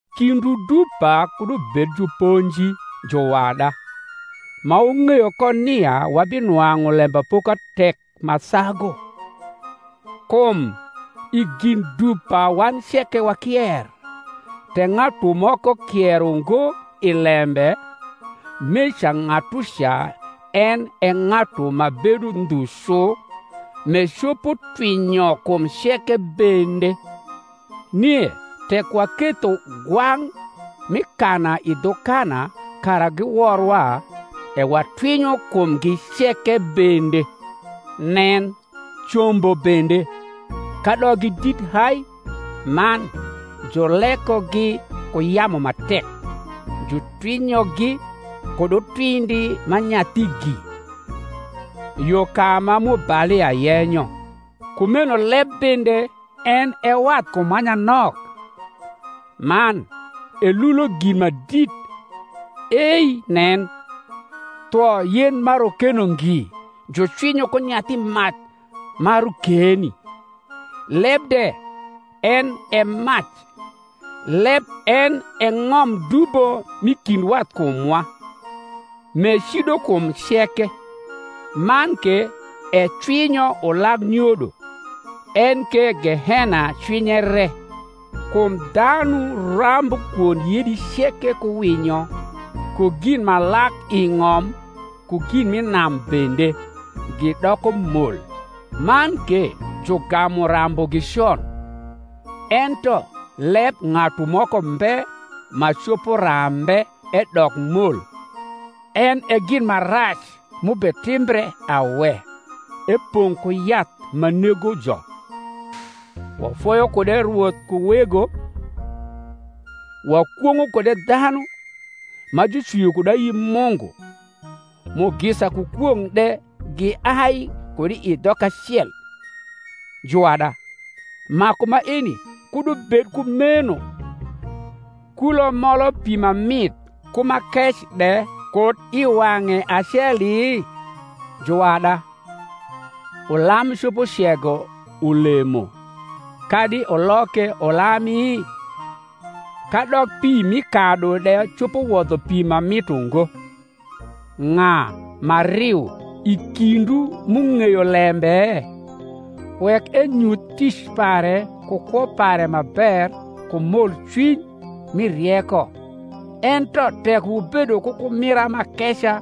Kindwu dupa kud ubed juponji, juwada, ma wung’eyo ko nia wabinwang’u lembapoka tek ma sagu. Kum i gin dupa wan ceke wakier. Tek ng’atu moko kier ungo i lembe, meca ng’atuca en e ng’atu ma bedo ndhu cu, m’ecopo twinyo kum ceke bende. Nie tek waketho gwang’ mi kana i dhu kana kara giworwa, e watwinyo kumgi ceke bende. Nen, combo bende, kadok gi dit hai man julekogi ku yamu ma tek, jutwinyogi kud utwindi ma nyathigi, yo ka ma mubalia yenyo. Kumeno leb bende en e wathkum ma nyanok, man elulo gin ma dit. Ei nen, thwo yen ma rokeno ngi jucwinyo ku nyathi mac ma rokeni! Leb de en e mac: leb en e ng’om dubo m’i kind wathkumwa, m’ecido kum ceke, man ke ecwinyo ulag nyodo, en ke gehena cwinye re. Kum dhanu rambu kwond yedi ceke ku winyo, ku gin ma lak i ng’om ku gin m’i nam bende, gidoko mol, man ke jugamu rambugi con: ento leb ng’atu moko mbe ma copo rambe edok mol; en e gin ma rac m’ubetimbre awe, epong’ ku yath ma negojo. Wafoyo kude Rwoth ku Wego; wakwong’o kude dhanu, ma jucwio kud ayi Mungu; mugisa ku kwong’ de giai kud i dhok acel. Juwada, maku maeni kud ubed kumeno. Kulo molo pi ma mit ku ma kec de kud i wang’e aceli? juwada, ulam copo cego ulemo, kadi ulok ke ulami? kadok pi mi kadu de copo wodho pi ma mit ungo. Ng’a ma riu i kindwu m’ung’eyo lembe? wek enyuth tic pare ku kwo pare ma ber ku molcwiny mi rieko. Ento tek wubedo ku kumira m’akeca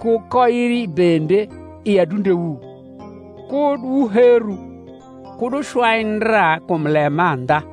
ku koiri bende i adundewu, kud wuheru, kud wucwai ndra kum lemandha.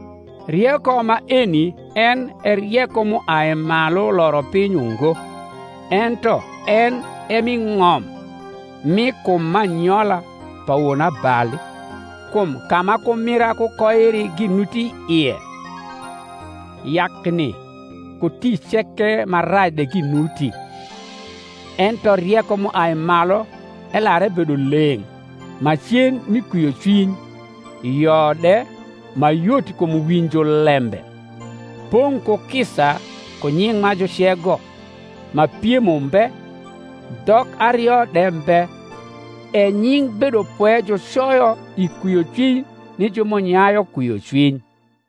Rieko maeni en e rieko m’uai malu loro piny ungo, ento en e m’i ng’om, mi kum m’anyola, pa wonabali. Kum ka ma kumira ku koiri ginuti ie, yakni ku tic ceke ma rac de ginuti. Ento rieko m’uai malu elar ebedo leng’, macen mi kwiocwiny, yo de, ma yot kum winjo lembe, pong’ ku kisa ku nying’ ma jucego, ma piem umbe, dhok ario de mbe. E nying’ bedopwe jucoyo i kwiocwiny ni ju m’unyayu kwiocwiny.